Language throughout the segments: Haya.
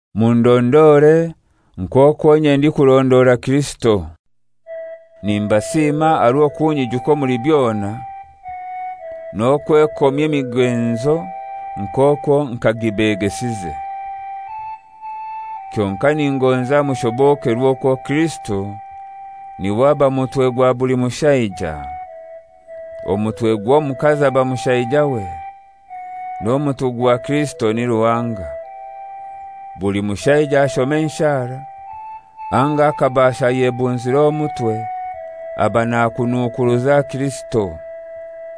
Mundondore nk'okwo inye ndikurondora Kirisito. Nimbasiima aha rw'okunyijuka omuli byona n'okwekomya emigenzo nk'okwo nk'agibegesize. Kyonkai ningonza mushobokerwe okwo Kirisito n'iwe aba mutwe gwa buli mushaija. Omutwe gw'omukazi aba mushaijawe; n'omutwe gwa Kirisito ni Ruhanga. Buli mushaija ashoma enshara anga akabaasha ayebunzire omutwe aba nakunukuruza Kirisito,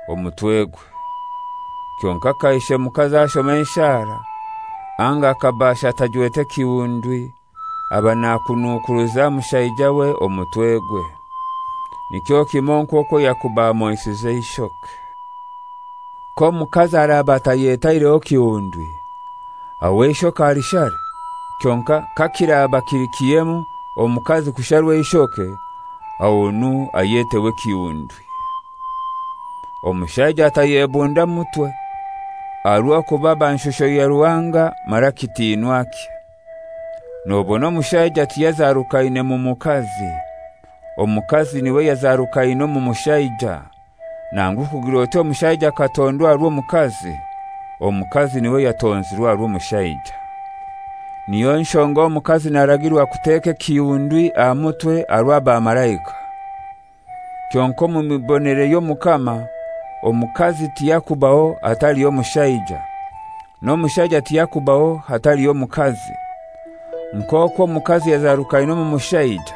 omutwegwe. Kyonkai kaishe mukazi ashoma enshara anga akabaasha atajwete kihundwi aba nakunukuruza mushaijawe, omutwegwe; nikyo kimoi nk'okwo yakuba amoisize eishoke. K'omukazi araba atayetaireho kihundwi, aho eishoke alishare. Kyonkai kakiraba kili kihemu omukazi kusharwa eishoke, ahonu ayeteho ekihundwi. Omushaija atayebunda mutwe, aha rw'okuba aba nshusho ya Ruhanga mara kitinwakye. (Nobona omushaija tiyazarukaine mu mukazi; omukazi n'iwe yazarukaine omu mushaija. Nangu kugir'oti omushaija akatondwa aha rw'omukazi; omukazi n'iwe yatonzirwe aha rw'omushaija.) Niyo nshonga omukazi naragirwa kuteka ekihundwi aha mutwe aha rw'abamalaika. (Kyonkai omu mibonere y'Omukama omukazi tiyakubaho hataliho mushaija, n'omushaija tiyakubaho hataliho mukazi. Nk'okwo omukazi yazarukaine omu mushaija,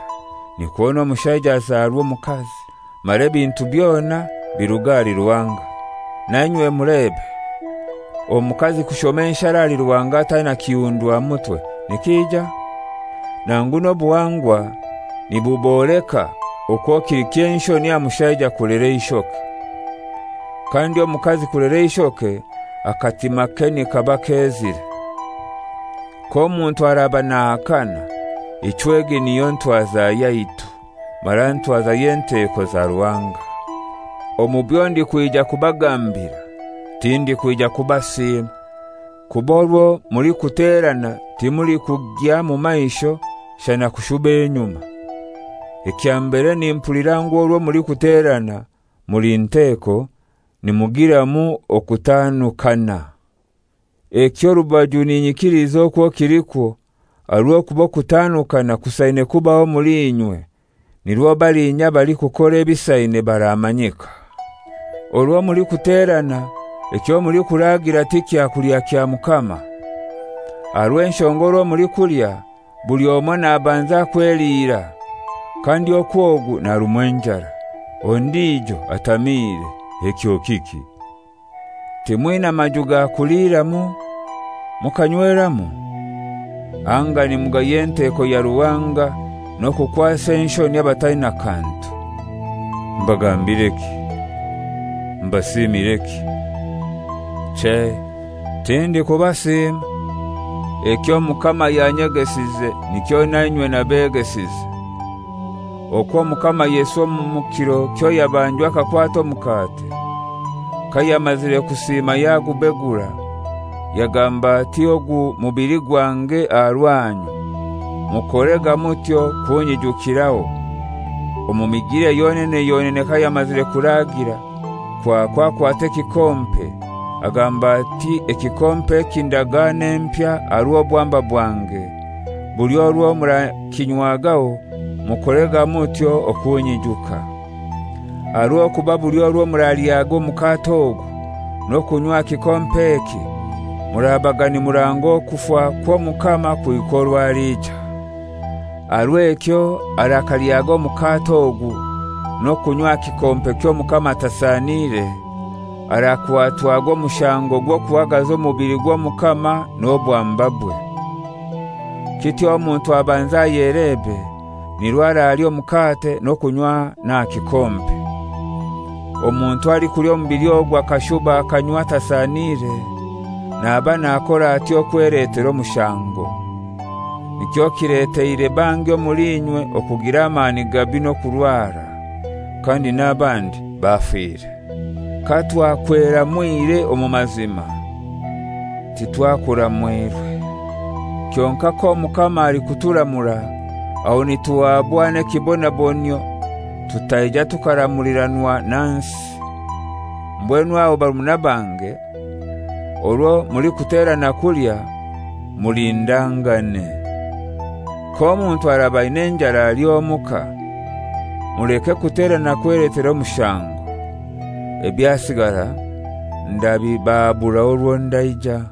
nikwo n'omushaija azarwa omukazi; mara ebintu byona biruga ahali Ruhanga.) Nainywe mulebe; omukazi kushoma enshara ahali Ruhanga ataina kihundwi aha mutwe, nikija? Nangu n'obuhangwa nibuboleka okwo kili ky'enshoni aha mushaija kulera eishoke. Kandi omukazi kulera eishoke akatimake nikaba kezire. K'omuntu araba nahakana, ichwe egi niyo ntwaza yaitu, mara ntwaza y'enteko za Ruhanga. Omu byo ndikwija kubagambira tindikwija kubasiima, kuba orwo mulikuterana timulikugya mu maisho shana kushuba enyuma. Ekya mbere nimpulira ngu orwo mulikuterana muli nteko nimugiramu okutanukana. Ekyo orubaju ninyikiliza okwo kilikwo, aha rw'okuba okutanukana kusaine kubaho omuli inywe, nirwo balinya abalikukora ebisaine baramanyika. Orwo mulikuterana ekyo mulikuraagira ti kyakulya kya Mukama. Aha rw'enshonga orwo mulikulya, buli omoi nabanza kweliira, kandi okwo ogu narumwa enjara, ondijo atamiire. Ekyo kiki? Timwina maju ga kuliiramu mukanyweramu? Anga nimugaya enteko ya Ruhanga n'okukwasa enshoni abataina kantu? Mbagambireki? Mbasiimireki? Chei, tindikubasiima. Eky'Omukama yanyegesize nikyo na inywe nabegesize: Okwo Omukama Yesu omu kiro kyo yabanjwa akakwata omukate, kayamazire kusiima yagubegura, yagamba ati, «Ogu mubili gwange aha rwanyu. Mukorega mutyo kunyijukiraho.» Omu migilire yonene yonene kayamazire kuraagira kwakwo akwata ekikompe, agamba ati, «Ekikompe eki ndagano empya aha rw'obwamba bwange, buli orwo murakinywagaho mukorega mutyo okunyijuka.» Aha rw'okuba buli orwo muralyaga omukate ogu, n'okunywa aha kikompe eki, murabaga nimuranga okufa kw'Omukama kuhika orwo aliija. Aha rw'ekyo arakalyaga omukate ogu n'okunywa aha kikompe ky'Omukama atasaniire, arakwatwaga omushango gw'okuhagaza omubili gw'Omukama n'obwambabwe. Kityo omuntu abanze ayelebe, nirwo aralya omukate n'okunywa n'aha kikompe. Omuntu alikulya omubili ogu akashuba akanywa atasaniire, naba nakor'atyo kweletera omushango. Nikyo kileteire bangi omuli inywe okugira amani gabi n'okurwara; kandi n'abandi bafire. Katwakweramwire omu mazima, titwakuramwirwe. Kyonkai k'Omukama alikuturamura, aho nituhaabwa n'ekibonabonyio tutaija tukaramuliranwa na nsi. Mbwenu aho barumuna bange, orwo mulikuterana kulya, mulindangane. K'omuntu araba aina enjara alye omuka, muleke kuterana kweletera omushango. Ebyasigara ndabibahaburaho orwo ndaija.